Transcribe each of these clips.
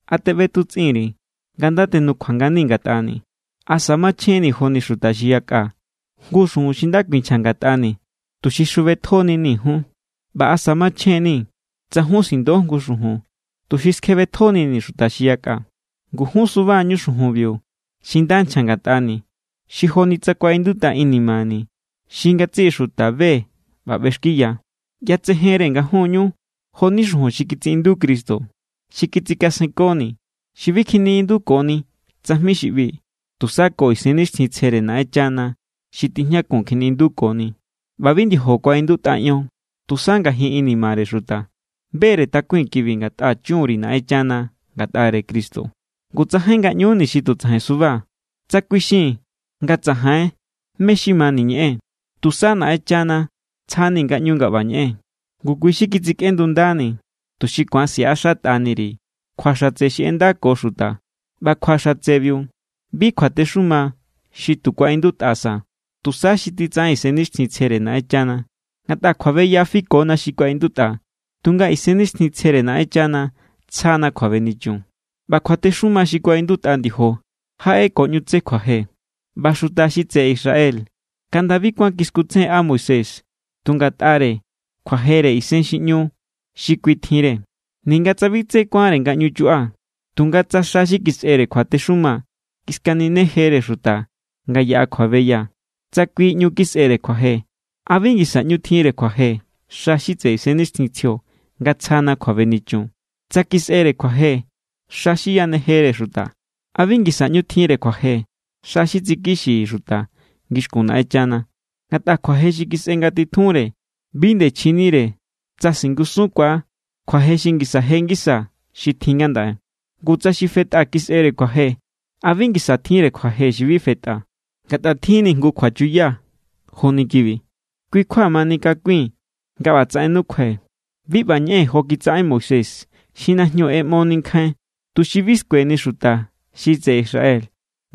¿A teꞌbetutsꞌin_ri̱ nga nda tenukjua nganii̱ ngatꞌani̱? ¿Asa machjenni̱ joni xuta xi yakꞌa jngu xujun xi nda kuinchja ngatꞌani̱, tuxi xjubetjo=nini̱ jun? ¿ꞌBa asa machjen=ni̱ tsa jun sindo jngu xujun, tuxi skjebetjonii̱ xuta xi yakꞌa? Ngu jun suba=ñu xujunbiu xi nda nchja ngatꞌani̱, xi joni tsa kuaꞌindutꞌa inimani̱ xi ngatsiꞌi xuta be= ꞌba ꞌbexkiya. ꞌYatsejen=re nga jun=ñu jo=ni xujun xi kitsiꞌindu Cristo, xi kitsikasenkoni̱, xi bi kjiniꞌindukoni tsajmi xi ꞌbi. Tusa ko Isennixtjintsjere Naꞌenchana xi tijñakun kjiniꞌindukoni. ꞌBa bi ndiojo kuaꞌindutꞌa ion, tusa ngajin inimare xuta. Be=re takui̱n kibi ngatꞌa chun_ri̱ Naꞌenchana ngatꞌare Cristo. Ngu tsajain ngaꞌñuni̱ xi tu tsajain suba, tsa kuixii̱n nga tsajain mé= xi mani̱ ñeꞌee̱n. Tusa Naꞌenchana tsjani̱ ngaꞌñu nga ꞌba ñeꞌee̱n. Ngu kui xi kitsikꞌendundeni̱, tuxi ku̱an siꞌaxatꞌani_ri̱ kjua xatse xi ꞌendako xuta. ꞌBa kjua xatsebiu, bi kjuatexuma xi tu kuaꞌindutꞌa sa, tusa xi titsaꞌen Isennixtjintsjere Naꞌenchana. Ngatꞌa kjuabeya fikona xi kuaꞌindutꞌa, tunga Isennixtjintsjere Naꞌenchana tsjana kjuabenichun. ꞌBa kjuatexuma xi kuaꞌindutꞌa ndiojo jaꞌe ko ꞌñu tse kjuaje. ꞌBa xuta xi tseꞌe Israel kaꞌnda bi kuán kiskutsejenꞌa Moisés tu ngatꞌare kjuajere isen xi ꞌñu xi kui tjinre, ninga tsa bi tsé ku̱anre nga ꞌñu chuꞌa. Tunga tsa xa xi kisꞌere kjuatexuma kiskaninejere xuta nga yaꞌa kjuabeya, tsa kui ꞌñu kisꞌere kjuaje, ¿a bi ngisa ꞌñu tjinre kjuaje xa xi tseꞌe Isennixtjintsjio nga tsjana kjuabenichun? Tsa kisꞌere kjuaje xa xi yanejere xuta, ¿a bi ngisa ꞌñu tjinre kjuaje xa xi tsikixi xuta ngixkun Naꞌenchana? Ngatꞌa kjuaje xi kisꞌe ngatitjunre bi nde chjinire tsa singusunkuaa̱ kjuaje xi ngisa je ngisa xi tjin ngandaꞌe. Ngu tsa xi fetꞌa kisꞌere kjuaje, ¿a bi ngisa tjinre kjuaje xi bi fetꞌa? Ngatꞌa tjin=ni̱ jngu kjuachuya joni kibi, kui= kjua manikakui̱n nga ꞌbatsaꞌen nukjuai̱. Bi ꞌba ñeꞌee̱n jo kitsaꞌen Moisés xi najñu ꞌeꞌmoni nkjain, tuxi bi skueni xuta xi tseꞌe Israel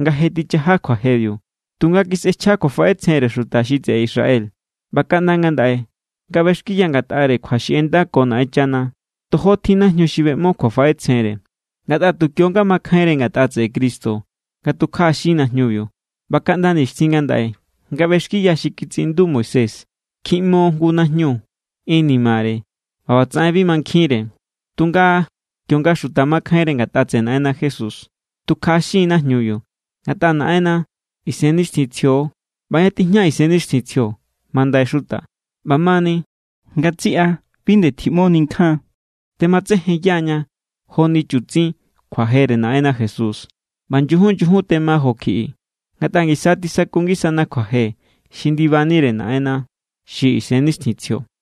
nga je tichaja kjuajebiu. Tunga kisꞌechja kjuafaꞌetsjenre xuta xi tseꞌe Israel. ꞌBa kaꞌnda ngandaꞌe, nga ꞌbexkiya ngatꞌare kjua xi ꞌendako Naꞌenchana, tojo tjin najñu xi beꞌmo kjuafaꞌetsjenre. Ngatꞌa tu kionga makjainre ngatꞌa tseꞌe Cristo nga tukjaꞌaxin najñubiu. ꞌBa kaꞌnda nixtjin ngandaꞌe, nga ꞌbexkiya xi kitsiꞌindu Moisés, kjiꞌmo jngu najñu inimare ꞌba ꞌbatsaꞌen bi mankjinre. Tunga kionga xuta makjainre ngatꞌa tseꞌe Naꞌenna Jesús, tukjaꞌaxin= najñubiu. Ngatꞌa Naꞌenna Isennixtjintsjio=. ꞌBa ña tijña Isennixtjintsjio, mandai xuta. ꞌBamani, ngatsiꞌa bi nde tjiꞌmoni nkjain. Tematsejenya=ña joni chutsin kjuajere Naꞌenna Jesús. ꞌBa nyujun nyujun tema jo kjiꞌi, ngatꞌa ngisa tisaku ngisana kjuaje xi ndibanire Naꞌenna xi Isennixtjintsjio.